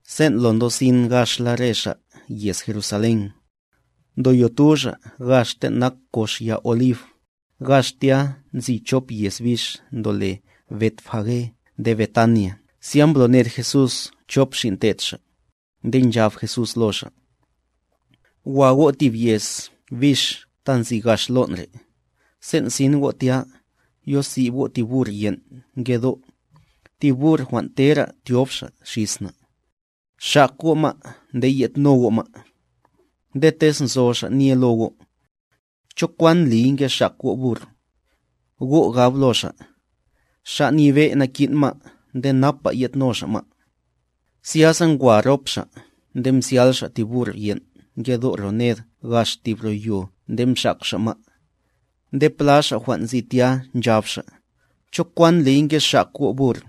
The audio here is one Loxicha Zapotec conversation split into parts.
Sen' lo ndosin gaxla re xa' yez Jerusalén, ndoyotu xa' gax ten' nak kox ya Olib, gax tya nzi chop yez bix ndole Betfage nde Betania zya mbloned Jesús chop xin' te'd Xa', nde nchab Jesús lo xa': —Wa go' tib yez bix ta nzi gax lon' re', sen' sin go' tya, yosib go' tib burr yen' ngedo', tib burr jwan' tera tyob xa' xis na'. Xak go' ma' nde yedno go' ma'. Nde tez nzo xa' nye lo go': “¿Cho kwan ndliy ngexak go' burr?” Go' gab lo xa': “Xa' Nyebe' nakin' ma' nde napa yedno Xa' ma'.” Zyasa ngwa rop xa' nde mzyal xa' tib burr yen' ngedo' ro ned gax tib ro yo nde mxak xa' ma'. Nde pla xa' jwan' nzi tya, nchab xa': —¿Cho kwan ndliy ngexak go' burr?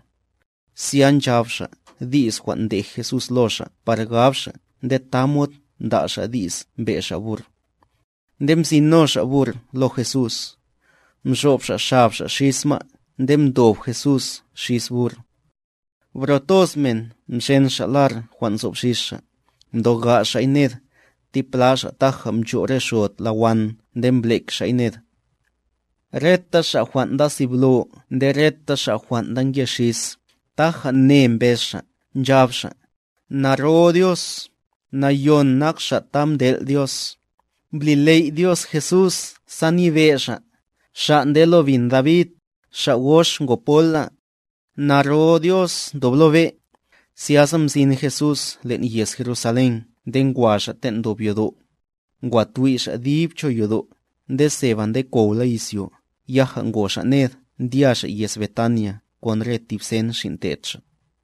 Zya nchab xa' di's jwan' mdej Jesús lo xa' par gab xa' nde tamod mda' xa' di's mbe' xa' burr. Nde mzin no xa' burr lo Jesús, mxob xa' xab xa' xis ma' nde mdob Jesús xis burr. Bro toz men mxen xa' lar jwan' nzob xis xa', mtoga' xa'y ned, tipla xa' taja mcho' re xod la wan nde mblek xa'y ned. Reta xa' jwan' nda siblo nde reta xa' jwan' ndanke xis, taja ne mbez xa', nchab xa': —¡Naro Dios, Nayon nak Xa' ta mtel' Dios! ¡Mbli ley' Dios Jesús sa nyebe' Xa', Xa' nde lo bin David, xa' gox ngo pola! ¡Naro Dios ndob lo be'! Zyasa mzin Jesús len' yez Jerusalén nde ngwa Xa' ten' ndob yodo'. Ngwa twi' Xa' dib cho yodo', nde seba ndekowla izyo, yaja ngo Xa' ned ndya Xa' yez Betania kon re tib sen xin' te'd Xa'.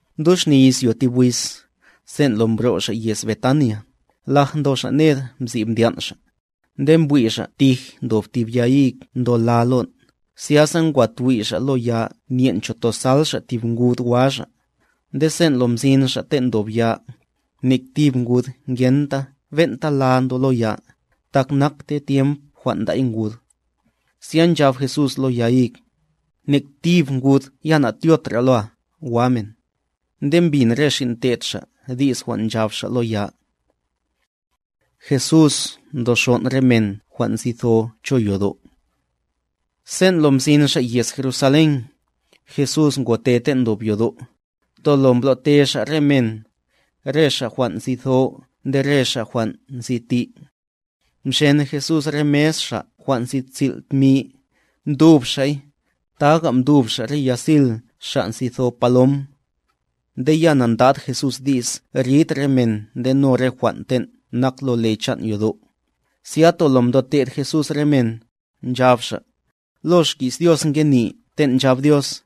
Mduxni izyo tib wiz, sen' lo mbro' xa' yez Betania, laj ndo xa' ned msib ndyan' xa'. Nde mbwi' xa' tij ndob tib ya hig ndo la lon', zyasa ngwa twi' xa' lo ya nyen' cho tozal tib ngud wa xa'. Nde sen' lo mzin xa' ten' ndob ya, nek tib ngud ngenta ben'ta la ndo lo ya, tak nakte tyemp jwan' nda'y ngud. Zya nchab Jesús lo ya hig: —Nek tib ngud ya natyotra loa, wa men. Nde mbin re xin' te'd Xa' di's jwan' nchab Xa' lo ya. Jesús mtoxon' re men jwan' nzi tho cho yodo' Sen' lo mzin xa' yez Jerusalén, Jesús ngote ten' ndob yodo', tolo mblote Xa' re men, re xa' jwan' nzi tho nde re xa' jwan' nzi ti'. Mxen Jesús re mes xa' jwan' nsil' tmi, mtub Xa'y, taga mtub Xa' re yasil xa' nzi tho palom. Nde ya na'ndad Jesús di's rid re men ndeno re jwan' ten' nak lo le chan' yodo'. Zya tolo mtote'd Jesús re men, nchab Xa': —Lo xki's Dios ngeni ten' nchab Dios: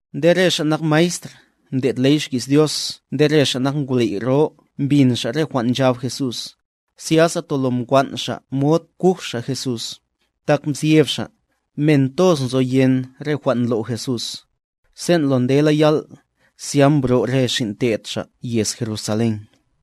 Nde re xa' nak maestr ndlo' ley xki's Dios nde re ngwley' jwan' nyebe' mbin xa' re jwan' nchab Jesús, zyasa tolo mkwan' xa' mod kuj xa' Jesús, tak nzyeb xa', men toz nzoyen re jwan' ndlo' Jesús. Sen' lo ndela yal', zya mbro' re xin' te'd Xa' yez Jerusalén.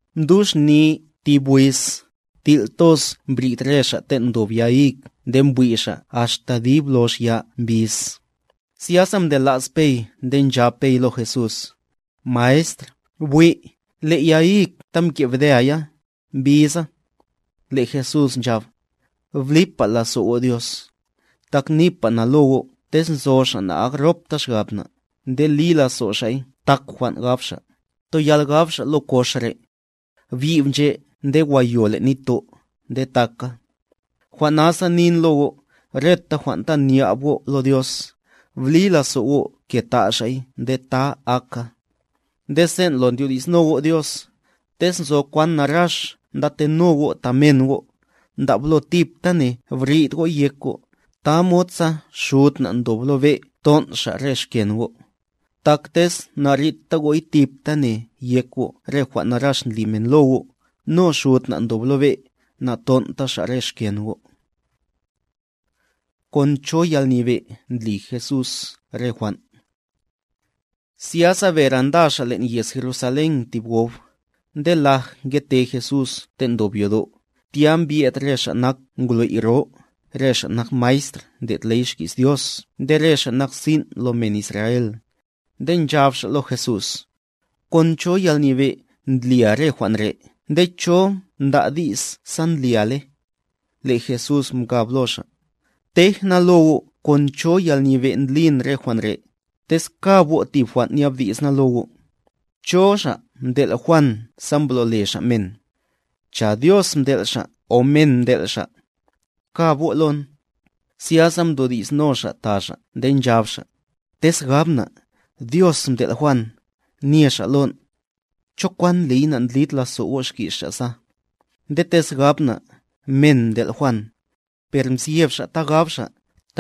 Mduxni tib wiz, til' toz mbrid re xa' ten' ndob ya hig nde mbwi' xa' axta dib lox ya mbiz. Zyasa mtela's Pey nde nchab Pey lo Jesús: —Maestr, bwi', le' ya hig ta mke' bdea ya, mbiza. Le' Jesús nchab: —Blipa lazo' go' Dios. Tak nipa na lo go' tez nzo xa' na'akropta xgab na', nde li lazo' xa'y tak jwan' gab xa', toyal gab xa' lo kox re': “Byib nche' nde wa yo len' nitto'”, nde taka. Jwan' nasa nin lo go', reta jwan' ta nyab go' lo Dios, bli lazo' go' ke ta' Xa'y nde ta aka. Nde sen' lo ndyodi'sno go' Dios, tez nzo kwan narax ndateno go' ta men go', ndablo tiptane brid go'y yek go', tamod sa Xud na' ndob lo be' ton' Xa' re xken go'. Tak tez narita go'y tiptane yek go' re jwan' narax ndli men lo go', no Xud na' ndob lo be', naton'ta Xa' re xken go'. ¿Kon cho yalnyebe' ndli Jesús re jwan'? Zyasa bere nda xa' len' yez Jerusalén tib gob. Nde laj ngete Jesús ten' ndob yodo', tya mbye'd re ngwley' jwan' nyebe', re xa' nak maestr ndlo' ley xki's Dios nde re xa' nak sin' lo men Israel. Nde nchab xa' lo Jesús: —¿Kon cho yalnyebe' ndlia re jwan' re' nde cho mda' di's sa ndli le? Le' Jesús mkab lo xa': —Tej na lo go' kon cho yalnyebe' ndlin re jwan' re', tez kab go' tib jwan' nyabdi's na lo go'. ¿Cho xa' mtel' Juan sa mblole xa' men? ¿Cho Dios mtel' xa' o men mtel' xa'? Pkab go' lon. Zyasa mdodi'sno xa' ta xa' nde nchab xa': —Tez gab na': “Dios mtel' Juan”, nye xa' lon': “¿Cho kwan ndliy nandlid lazo' go' xki's xa' sa?” Nde tez gab na': “Men mtel' Juan”... Per mzyeb xa' ta gab xa',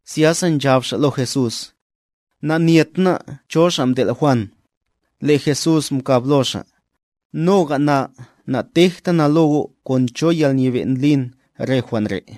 Zyasa nchab xa' lo Jesús: —Nanyet ná' cho xa' mtel' Juan. Le' Jesús mkab lo xa': —Noga na natejta na lo go' kon cho yalnyebe' ndlin re jwan' re'.